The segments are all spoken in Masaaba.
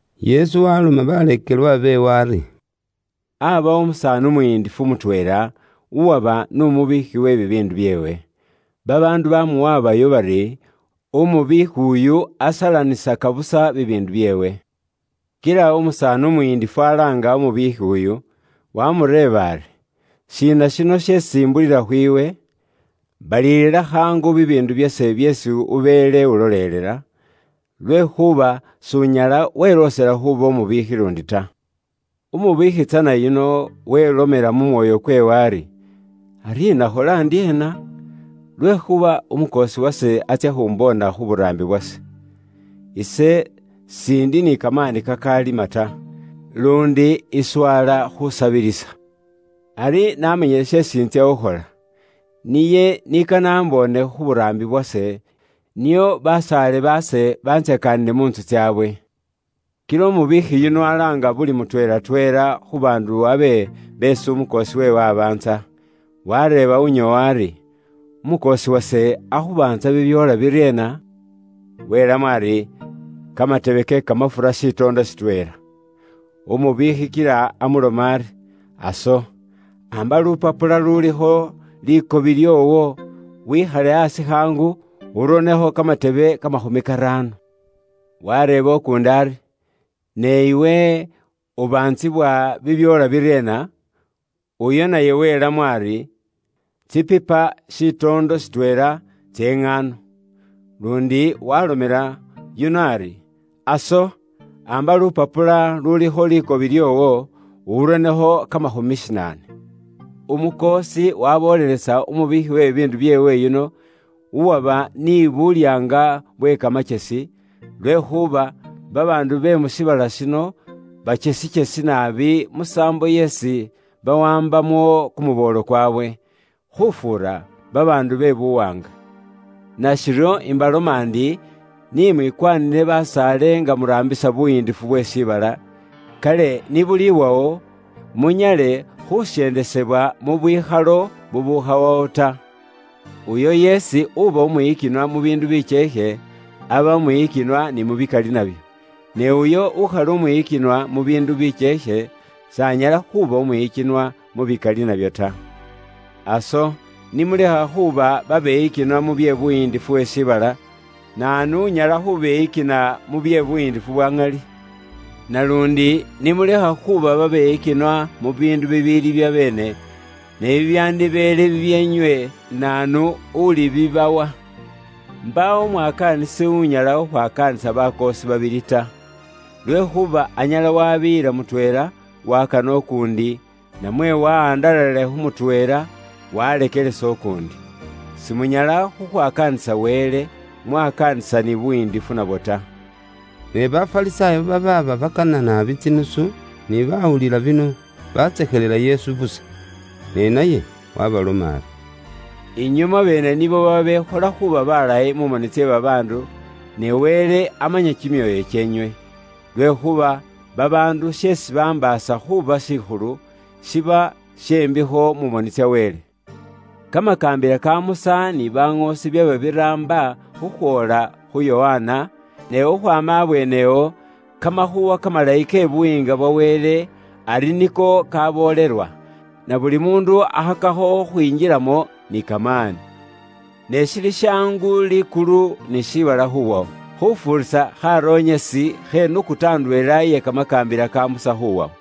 Yesu waloma baleekelwa beewe ari: “Aabawo umusaani umuyindifu mutweela, uwaba n'umubiikhi we bibiindu byeewe. Babaandu baamuwabayo bari, umubiikhi uyu asalanisaka busa bibiindu byeewe. Kila umusaani umuyiindifu alaanga umubiikhi uyu, waamureeba ari, ‘Shiina shino sheesi imbulila khwiiwe? Balilila khaangu bibiindu byase byeesi ubeele ulolelela, lwekhuuba s'unyala weloosela khuuba umubiikhi luundi ta.’ “Umubiikhi tsana yuno welomela mu mwoyo kweewe ari, ‘Ari inakhola ndyeena? Lwekhuuba umukoosi wase atsya khumboona khu buraambi bwase. Ise s'indi ni kamaani kakalima ta, luundi iswala khusabilisa. Ari namanyile sheesi intsya khukhola, niye ni kane amboone khu buraambi bwase, nio basaale baase bantsakaanile mu ntsu tsaabwe.’ “Kila umubiikhi yuno alaanga buli mutweelatweela khu baandu abe beesi umukoosi weewe abaantsa. Wareeba unyoowa ari, ‘Umukoosi wase akhubaantsa bibyoola biryeena?’ Welamo ari, ‘Kamatebe ke kamafura shitoondo shitweela.’ Umubiikhi kila amuloma ari, ‘Aso, amba lupapula lulikho likobi lyoowo, wikhale aasi khaangu, uronekho kamatebe kamakhumi karaano.’ “Wareeba ukuundi ari, ‘Ne iwe, ubaantsibwa bibyoola biryeena?’ Uyo naye welamo ari, ‘Tsipipa shitoondo shitweela tse ŋaano.’ Luundi waalomela yuno ari, ‘Aso, bukula lupapula lulikho likobi lyoowo, uronekho kamakhumi shinaane.’ “Umukoosi waruuya umubiikhi we bibiindu byeewe yuno, uwaba abe ukhola bye bubwoonaki bwe kamakyesi, lwekhuuba babaandu be mu shiibala shino bakyesikyesi naabi musaambo yeesi bawaambamo kumuboolo kwawe, khufuura babaandu be buwaanga. Nashiryo, ise imbaloma ndi, ni mwikwanile basaale nga muraambisa bye bubwoonaki bwe buyiindifu bwe shiibala, kale ni buliwawo, munyale khusyendesebwa mu bwikhalo bubukhawawo ta. Uyo yeesi uba umwiyikinwa mu biindu bikyeekhe, aba umwiyikinwa ni mu bikali nabyo. Ne uyo ukhali umwiyikinwa mu biindu bikyeekhe, s'anyala khuuba umwiyikinwa mu bikali nabyo ta. Aso, ni mulekha khuuba babeyikinwa mu bye buyiindifu bwe shiibala, naanu unyala khubeyikina, mu bye buyiindifu bwa ŋali? Naluundi, ni mulekha khuuba babeyikinwa mu biindu bibiili byabeene, ne bibyandibeele bibyeenywe naanu ulibibawa? “Mbaawo umwakaanisi unyala khukhwakaanisa bakoosi babili ta. Lwekhuuba anyala wabiiyila mutweela, wakana ukuundi, namwe wahandalalila khu mutweela, waleekelesa ukuundi. Simunyala khukhwakaanisa Wele, mwakaanisa ni buyiindifu nabwo ta.” Ne Bafarisaayo babaaba bakana naabi tsinusu, ni bawulila bino batsekhelela Yesu busa. Ne naye waabaloma ari, “Inywe mwabeene nibo babekhola khuuba balayi mu moni tse babaandu, ne Wele amanya kimyoyo kyeenywe. Lwekhuuba babaandu sheesi bambaasa khuuba shikhulu, shiba she mbikho mu moni tsa Wele.” “Kamakaambila ka Musa ni baŋoosi byaba biraamba khukhwoola khu Yokana, ne khukhwaama abweenewo, Kamakhuuwa kamalayi ke Buyiinga bwa Wele ari niko kaboolelwa, na buli muundu akhakakho khukhwinjilamo ni kamaani. “Ne shili shaangu likulu ni shiibala khuwawo, khufuurisa kharonyesi khe nukuta ndweela iye Kamakaambila ka Musa khuwawo.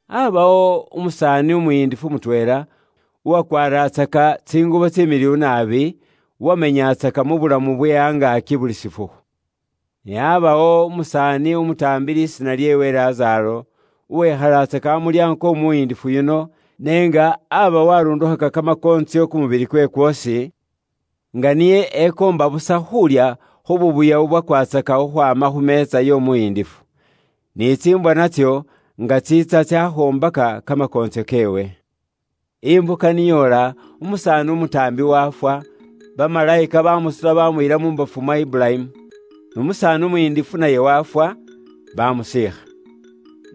“Aabawo umusaani umuyindifu mutweela, uwakwaaratsaka tsingubo tsimiliwu naabi, uwameenyatsaka mu bulamu bwe angaaki buli shifukhu. Ne aabawo umusaani umutaambi lisiina lyeewe Lazaaro, uwekhalatsaka amulyaango kw'omuyindifu yuno, n'enga aba waarundukhaka kamakoontsyo kumubili kweewe kwoosi, nga niye ekoomba busa khuulya khu buubuya bubwakwatsaka khukhwaama khu meetsa y'omuyindifu. Ni tsiimbwa natso nga tsiitsa tsakhoombaka kamakoontsyo keewe. “Imbuka ni yoola umusaani umutaambi waafwa, bamalayika baamusuta baamuyila mu mbafu mwa Iburayimu. N'umusaani umuyindifu naye waafwa, baamusiikha.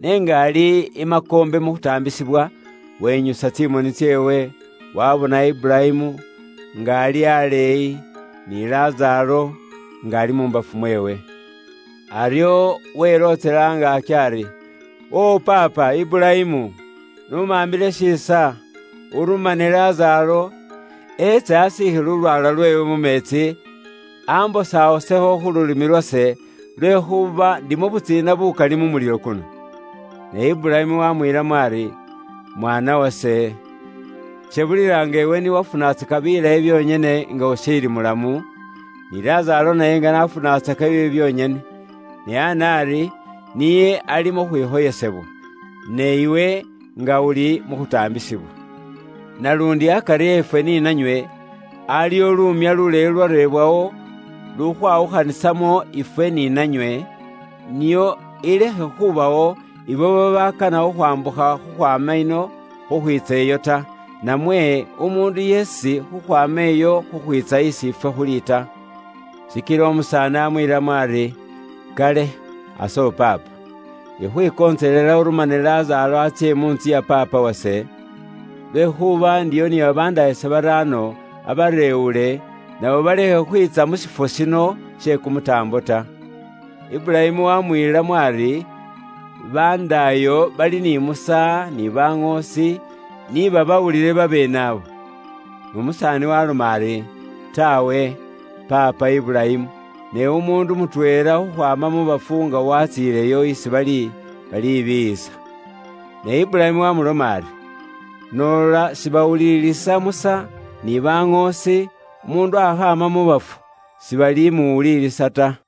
N'enga ali i makoombe mu khutaambisibwa, wenyusa tsimoni tseewe, waabona Iburayimu, nga ali aleeyi, ni Lazaaro, nga ali mu mbafu mweewe. Aryo welootsela angaaki ari, ‘Wo paapa Iburayimu, n'umaambile shiisa, urumane Lazaaro, eetse asiikhe lulwaala lweewe mu meetsi, ambosawosekho khu lulimi lwase, lwekhuuba ndi mu butsiina bukali mu mulilo kuno.’ “Ne Iburayimu waamwiilamo ari, ‘Mwaana wase, shebulila nga iwe ni wafunatsaka bilayi byonyene nga ushiili mulamu, ni Lazaaro naye nga n'afunatsaka biibi byonyene. Ne ana ari, niye ali mu khwikhoyesebwa, ne iwe nga uli mu khutaambisibwa. Naluundi akari efwe ni nanywe, aliwo luumya luleeyi lulwareebwawo lukhwawukhanisamo ifwe ni nanywe, nio ilekhe khubawo ibo babakana khukhwambukha khukhwaama ino khukhwiitsa iyo ta, namwe umuundu yeesi khukhwaama iyo khukhwiitsa isi ifwe khuli ta.’ “Shikila umusaani amwiilamo ari, ‘Kale, aso paapa, ikhwikontselela urumane Lazaaro atsye mu ntsu ya paapa wase, lwekhuuba ndiyo ni babandaayase baraano, abareewule, nabo balekhe khwiitsa mu shifwo shino she kumutaambo ta.’ “Iburayimu wamwiilamo ari, ‘Bandaayo bali ni Musa, ni baŋoosi, ni babawulile babeene ibo.’ “Nomusaani waaloma ari, ‘Taawe, paapa Iburayimu, ne umuundu mutweela khukhwaama mu bafu nga watsiileyo isi bali, balibiiyisa.’ “Ne Iburayimu waaloma ari, ‘Noola sibawulilisa Musa, ni baŋoosi, umuundu akhaama mu bafu, sibalimuwulilisa ta.’”